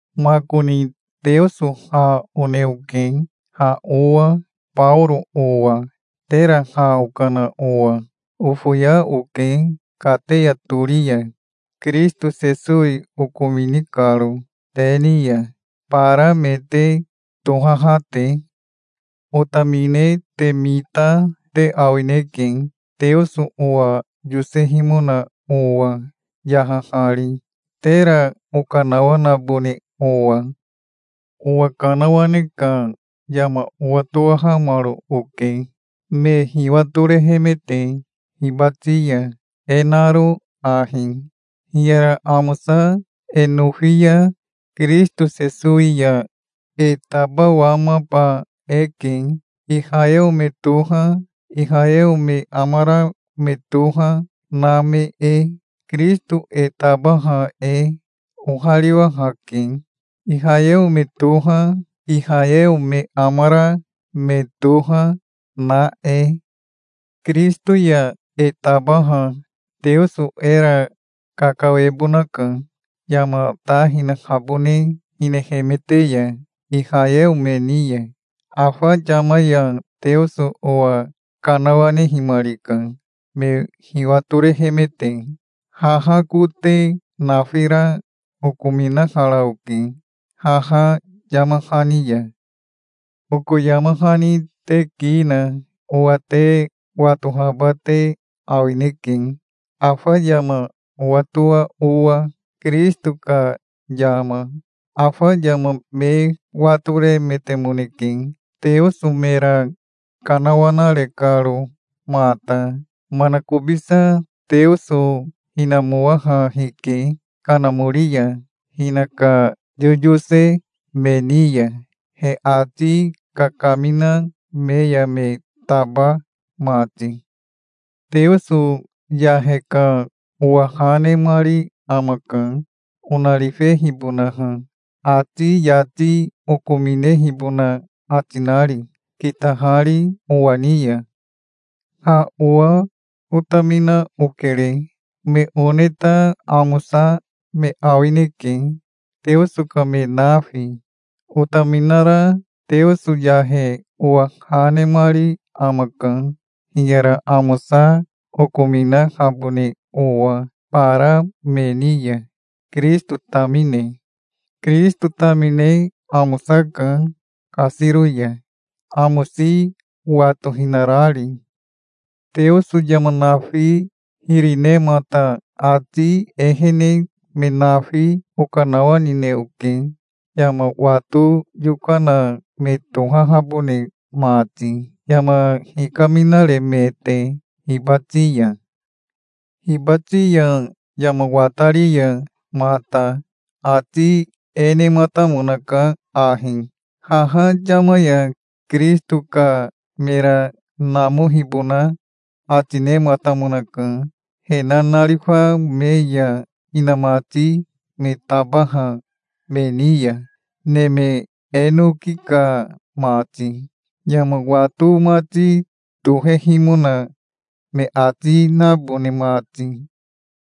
Makoni Teoso ha one oke, ha owa Baoro owa, tera ha okana owa. Ofoya oke kateya tori ya, Kirisito Sesowi okomini karo te ni ya, bara me te tohaha te. Otamine te mita te awineke, Teoso owa yosehimona owa, yahahari, tera okanawanabone owa. Owa kanawane ka yama owatowahamaro oke, me hiwatorehemete hibati ya, e naro ahi: Hiyara amosa e nofi ya Kirisito Sesowi ya e tabawamaba eke, Ihayeo me toha, Ihayeo me amara me toha, na me e. Kirisito e tabaha e ohariwahake, Ihayeo me toha, Ihayeo me amara me toha, na e. Kirisito ya e tabaha Teoso era kakawebonaka, yama ta hinahabone hinehemete ya Ihayeo me ni ya. Afa yama ya Teoso owa kanawanehimarika, me hiwatorehemete. Haha kote nafira okominahara oke haha yama hani ya. Oko yama hani te ki na owa te watohaba te awineke, afa yama owatoa owa, Kirisito ka yama. Afa yama me watoremetemoneke, Teoso mera kanawanare karo mata. Manakobisa Teoso hinamowaha hike Kanamori ya hinaka yoyose me ni ya, he ati kakamina me ya me taba mati. Teoso yahe ka owa ha nemari amaka, onarifehibonaha, ati yati okominehibona ati nari, kitahari owa ni ya. Ha owa otamina okere. Me one ta amosa me awineke, Teoso ka me nafi. Otaminara Teoso yahe owa ha nemari amaka, hiyara amosa okominahabone owa bara me ni ya, Kirisito tamine. Kirisito tamine amosaka kasiro ya, amosi watohinarari. Teoso yama nafi hiri nemata ati ehene me nafi okanawanine oke, yama wato yokana me tohahabone mati, yama hikaminaremete hibati ya. Hibati ya yama watari ya mata ati e nematamonaka ahi: Haha yama ya Kirisito ka mera namohibona ati nematamonaka he nanarifa me ya inamati me tabaha me ni ya, neme enoki ka mati, yama wato mati tohehimona me ati nabone mati.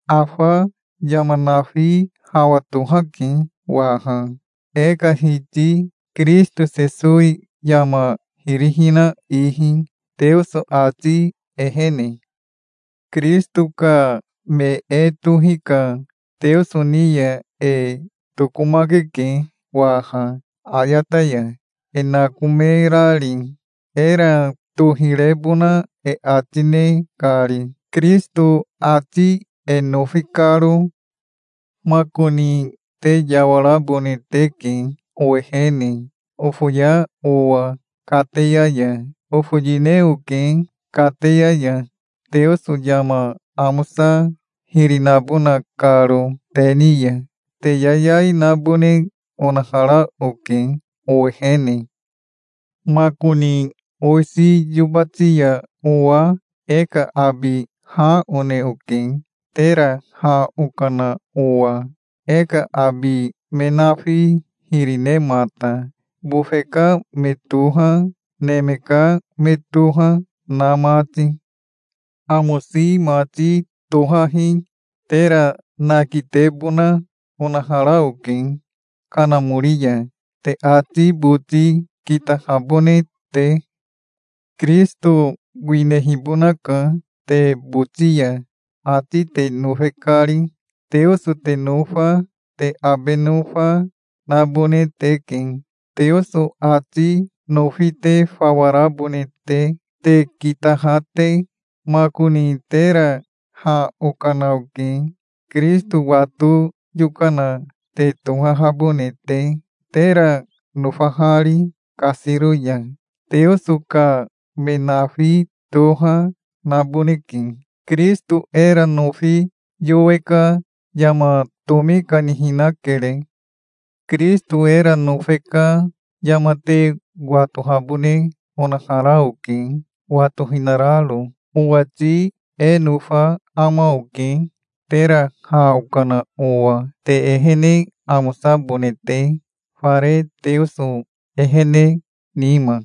Afa yama nafi hawa tohake waha, e ka Hiti Kirisito Sesowi yama hiri hina ihi, Teoso ati ehene. Kirisito ka me e tohi ka Teoso ni ya e tokomakeke waha ayata ya, e nakomerari, era tohirebona e ati ne kari, Kirisito ati e nofi karo. Makoni te yawarabone teke owehene, ofoya owa kateya ya. Ofoyine oke kateya ya, Teoso yama amosa hiri nabona karo te ni ya. Te yayai nabone onahara oke owehene. Makoni owisi yobati ya owa e ka abi ha one oke, tera ha okana owa, e ka abi me nafi hiri nemata, bofe ka me toha, neme ka me toha na mati. Amosi mati tohahi tera nakitebona onahara oke Kanamori ya, te ati boti kitahabone te. Kirisito winehibonaka te boti ya, ati te nofe kari. Teoso te nofa, te abe nofa, nabone teke, Teoso ati nofi te fawa rabone te, te kitaha te. Makoni tera ha okana oke, Kirisito wato yokana te tohahabone te, tera nofahari kasiro ya. Teoso ka me nafi toha naboneke. Kirisito era nofi yowe ka yama tomi kanihinakere. Kirisito era nofe ka yama te watohabone onahara oke, watohinararo. Owati e nofa ama oke tera ha okana owa, te ehene amosabone te, fare Teoso ehene nima.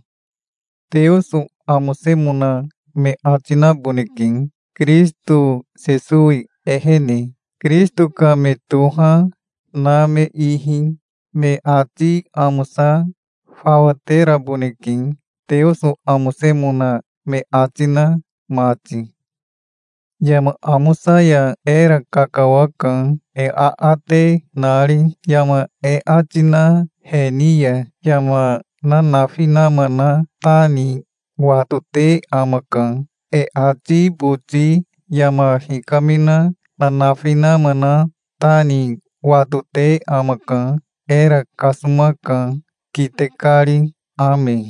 Teoso amosemona me ati naboneke, Kirisito Sesowi ehene, Kirisito ka me toha, na me ihi. Me ati amosa fawa teraboneke, Teoso amosemona me ati na mati. Yama amosa ya era kakawaka, e aate nari. Yama e ati na he ni ya yama nanafi nama na ta ni watote amaka. E ati boti yama hikamina nanafi nama na ta ni watote amaka. Era kasomaka, kite kari. Ame.